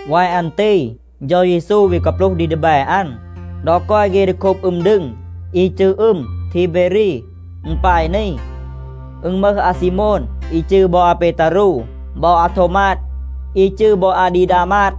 วาย อัน ตี เฌา เยซู วี กาปลูห ดี ดีแบ อัน ดอ กอย เฆ ดี โคบ อึม ดึง อี จืร อึม ทีเบรี. อึณ ปาย นี. อึณ มึห อาซีโมน, อี จืร บอ อาเปตารู บอ อาโทวมาด, อี จืร บอ อาดีดามาด,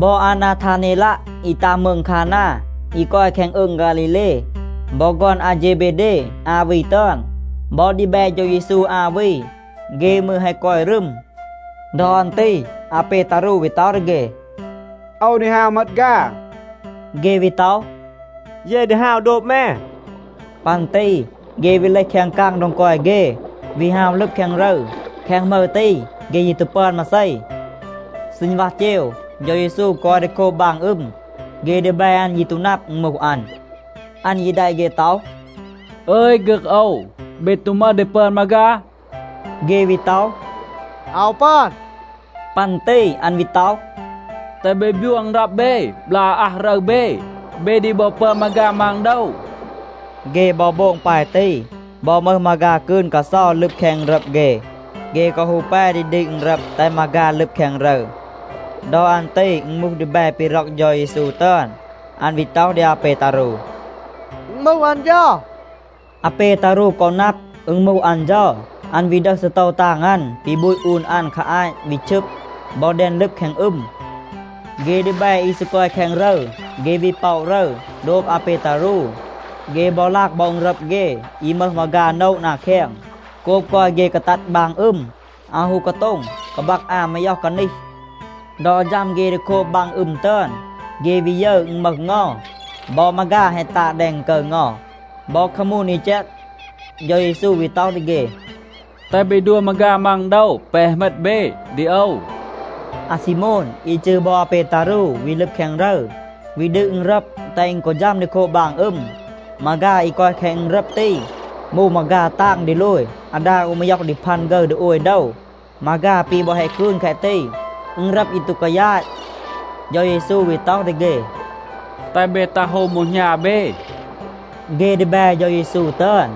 บอ อานาทาเนลัะ อี ตัห มืง คานา, อี กอย แคง อืง ฆาลีเล, บอ ฆอน อาเฌเบเด อา วี ตึอน, บอ ดีแบ เฌา เยซู อา วี, เฆ มืร แฮะ กอย รึม. ดอ อัน ตี อาเปตารู วี ต็อห ดี เฆ, “โอว ดี ฮาว เหมต ฆา.” เฆ วี ต็อห, “เย ดี ฮาว โดบ แม.” ปัน ตี เฆ วี เลห แคง กาง โดง กอย เฆ, วี ฮาว ลึบ แคง รึร. แคง หมึร ตี, เฆ ยี ตู ปึอน มาเซ. ซีณวัห เจว, เฌา เยซู กอย ดี โคบ บาง อึม. เฆ ดีแบ อัน ยี ตู นับ, อึณ มูห อัน. อัน ยี แดะ เฆ ต็อห, “อึย, ฆึก โอว, เบ ตู มึห ดี ปึอน มาฆา?” เฆ วี ต็อห, “อาว ปึอน.” ปัน ตี อัน วี ต็อห, “แตห เบ บยัว อึณรับ เบ บลาก อาอัห รึร เบ. เบ ดี บอ ปึอน มาฆา มัง โดว.” เฆ บอ โบง ปาย ตี, บอ มึห มาฆา กืน กาเซา ลึบ แคง อึณรับ เฆ. เฆ กอ ฮู แป ดี ดืด อึณรับ แตห มาฆา ลึบ แคง รึร. ดอ อัน ตี อึณ มูห ดีแบ ปี ร็อก เฌา เยซู ตึอน. อัน วี ต็อห ดี อาเปตารู, “อึณ มูห อัน เฌา.” อาเปตารู กอ นับ, อึณ มูห อัน เฌา, อัน วี ดึห ซีโตว ตาง อัน ปี บูต อูน อัน คา อาต วี ชึบ, บอ แดน ลึบ แคง อึม. เฆ ดีแบ อี ซี กอย แคง รึร, เฆ วี ป็อะ รึร, โดบ อาเปตารู. เฆ บอ ลาก บอ อึณรับ เฆ, อี มึห มาฆา โนะ นา แคง. โกบ กอย เฆ กาตัด บาง อึม, อาว ฮู กาโต็ง กาบัก อา มาย็อห กานีห. ดอ ฌัม เฆ ดี โคบ บาง อึม ตึอน, เฆ วี ยึร, อึณ มึห เงา, บอ มาฆา แฮะ ตาด แดง อึณกึร เงา, บอ คามูน อี แจก. เฌา เยซู วี ต็อห ดี เฆ, “แตห เบ ดัว มาฆา มัง โดว แปะ แฮะ เหมต เบ ดี โอว.” อาซีโมน อี จืร บอ อาเปตารู วี ลึบ แคง รึร, วี ดืด อึณรับ, แตห อึณ กอ ฌัม ดี โคบ บาง อึม. มาฆา อี กอย แคง อึณรับ ตี มูห มาฆา ตาง ดีโลย อาดา อู มาย็อห ดี พัน ฆึร ดี โอย โดว. มาฆา ปี บอ แฮะ กืน แคะ ตี, อึณรับ ยี ตู กายาต. เฌา เยซู วี ต็อห ดี เฆ, “แตห เบ ตัห โฮม โบม หณา เบ.” เฆ ดีแบ เฌา เยซู ตึอน,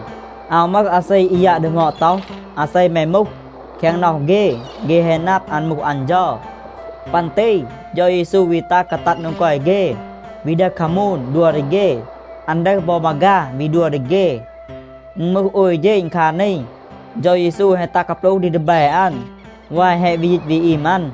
อาว มึห อาเซ อี ยัะ ดีหมอด ต็อห, “อาเซ แม มูห?” แคง น็อห เฆ, เฆ แฮะ นับ, อัน มูห อัน เฌา. ปัน ตี เฌา เยซู วี ตัห กาตัด โดง กอย เฆ, วี ดึห คามูน, ดัว ดี เฆ. อัน ดึห บอ มาฆา, วี ดัว ดี เฆ. อึณ มูห โอย เฌณ คา นี, เฌา เยซู แฮะ ตัห กาปลูห ดี ดีแบ อัน วาย แฮะ วี ยีต วี อีม อัน.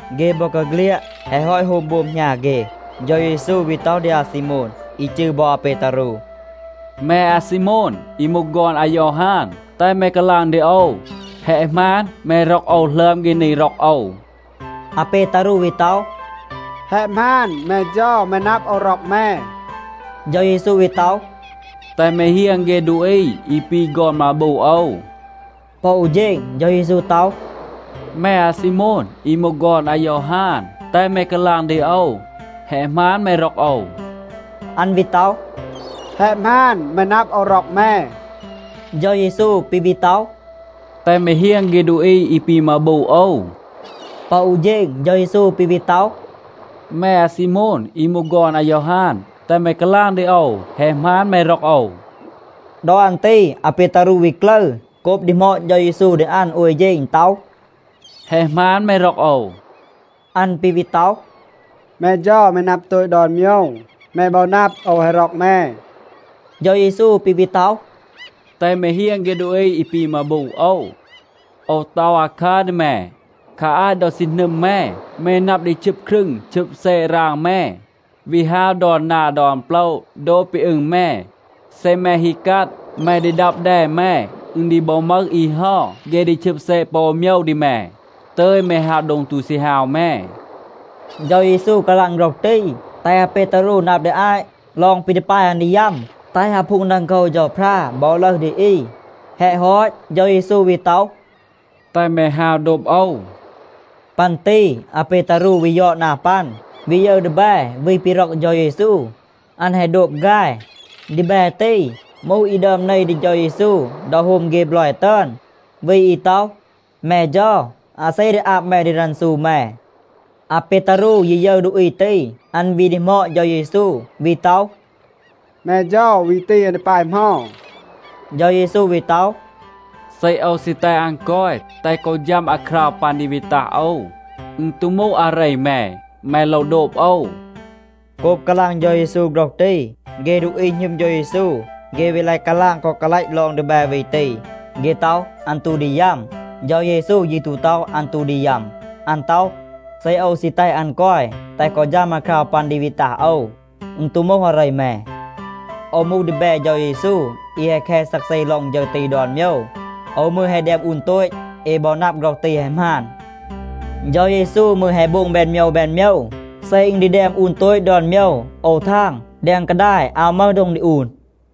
เฆ บอกาเฆลียด แฮะ ฮอต โฮม โบม หณา เฆ, เฌา เยซู วี ต็อห ดี อาซีโมน, อี จืร บอ อาเปตารู, “แม อาซีโมน อี มูห ฆอน อายอฮาน, แตห แม กาลาง ดี โอว. แฮะ หมาน, แม ร็อก โอว หลึอม เฆ นี ร็อก โอว?” อาเปตารู วี ต็อห, “แฮะ หมาน. แม เฌา, แม นับ, โอว ร็อก แม.” เฌา เยซู วี ต็อห, “แตห แม เฮียง เฆ ดูอี อี ปี ฆอน มาบู โอว.” ปอ อู เฌณ เฌา เยซู ต็อห, “แม อาซีโมน อี มูห ฆอน อายอฮาน, แตห แม กาลาง ดี โอว. แฮะ หมาน, แม ร็อก โอว?” อัน วี ต็อห, “แฮะ หมาน. แม นับ, โอว ร็อก แม.” เฌา เยซู ปี วี ต็อห, “แตห แม เฮียง เฆ ดูอี อี ปี มาบู โอว.” ปอ อู เฌณ เฌา เยซู ปี วี ต็อห, “แม อาซีโมน อี มูห ฆอน อายอฮาน, แตห แม กาลาง ดี โอว. แฮะ หมาน, แม ร็อก โอว?” ดอ อัน ตี อาเปตารู วี กลึร โกบ ดีหมอด เฌา เยซู ดี อัน โอย เฌณ ต็อห, “แฮะ หมาน, แม ร็อก โอว?” อัน ปี วี ต็อห, “แม เฌา, แม นับ โตต ดอน โมยว. แม บอ นับ, โอว แฮะ ร็อก แม.” เฌา เยซู ปี วี ต็อห, “แตห แม เฮียง เฆ ดูอี อี ปี มาบู โอว. โอว ต็อห อาคัร ดี แม. คา อาต ดอ ซี หนึม แม, แม นับ ดี ชึบ ครึง ชึบ แซะ ราง แม, วี ฮาว ดอน นา ดอน โปละ, โดบ ปี อึง แม. เซ แม ฮี กัด, แม ดี ดับ แด แม. อึณ ดี บอ มึห อี เฮา, เฆ ดี ชึบ แซะ ปอ อู โมยว ดี แม, ตึย แม ฮาว โดง ตู ซี ฮาว แม.” เฌา เยซู กาลาง โฆรห ตี, แตห อาเปตารู นับ ดี อาต ลอง ปี ดี ปาย อัน ดี ยัม, แตห อาพูง ดังโคว เฌาพรา บอ ลึห ดี อี. แฮะ ฮอต, เฌา เยซู วี ต็อห, “แตห แม ฮาว โดบ โอว.” ปัน ตี อาเปตารู วี ยอด นา ปัน, วี ยึร ดีแบ วี ปี ร็อก เฌา เยซู. อัน แฮะ โดบ ฆาย. ดีแบ ตี มูห อี ดึอม เน ดี เฌา เยซู ดอ โฮม เฆ บลอย ตึอน, วี อี ต็อห, “แม เฌา, อาเซ ดี อาบ แม ดี รันซู แม?” อาเปตารู ยี ยึร ดูอี ตี, อัน วี ดีหมอด เฌา เยซู, วี ต็อห, “แม เฌา, วี ตี อัน ดี ปาย เหมา?” เฌา เยซู วี ต็อห, “เซ โอว ซี แตห อัน กอย, แตห กอ ฌัม อาคราว ปัน ดี วี ตัห โอว, อึณ ตู มูห อาเร แม. แม โลว โดบ โอว.” โกบ กาลาง เฌา เยซู โฆรห ตี, เฆ ดูอี หณึม เฌา เยซู, เฆ วี ลาย กาลาง กอ กาลัต ลอง ดีแบ วี ตี. เฆ ต็อห, อัน ตู ดี ยัม. เฌา เยซู ยี ตู ต็อห, อัน ตู ดี ยัม. อัน ต็อห, “เซ โอว ซี แตห อัน กอย แตห กอ ฌัม อาคราว ปัน ดี วี ตัห โอว, อึณ ตู มูห อาเร แม.” โอว มูห ดีแบ เฌา เยซู, อี แฮะ แค ซักเซ ลอง ฌึร ตี ดอน โมยว. โอว มืร แฮะ แดม อูน โตต. เอ บอ นับ, โฆรห ตี แฮะ หมาน. เฌา เยซู มืร แฮะ โบง แบน โมยว แบน โมยว. เซ อึณ ดี แดม อูน โตต ดอน โมยว, โอว ทาง, แดง กาดาย อาว มึห โดง ดี อูน.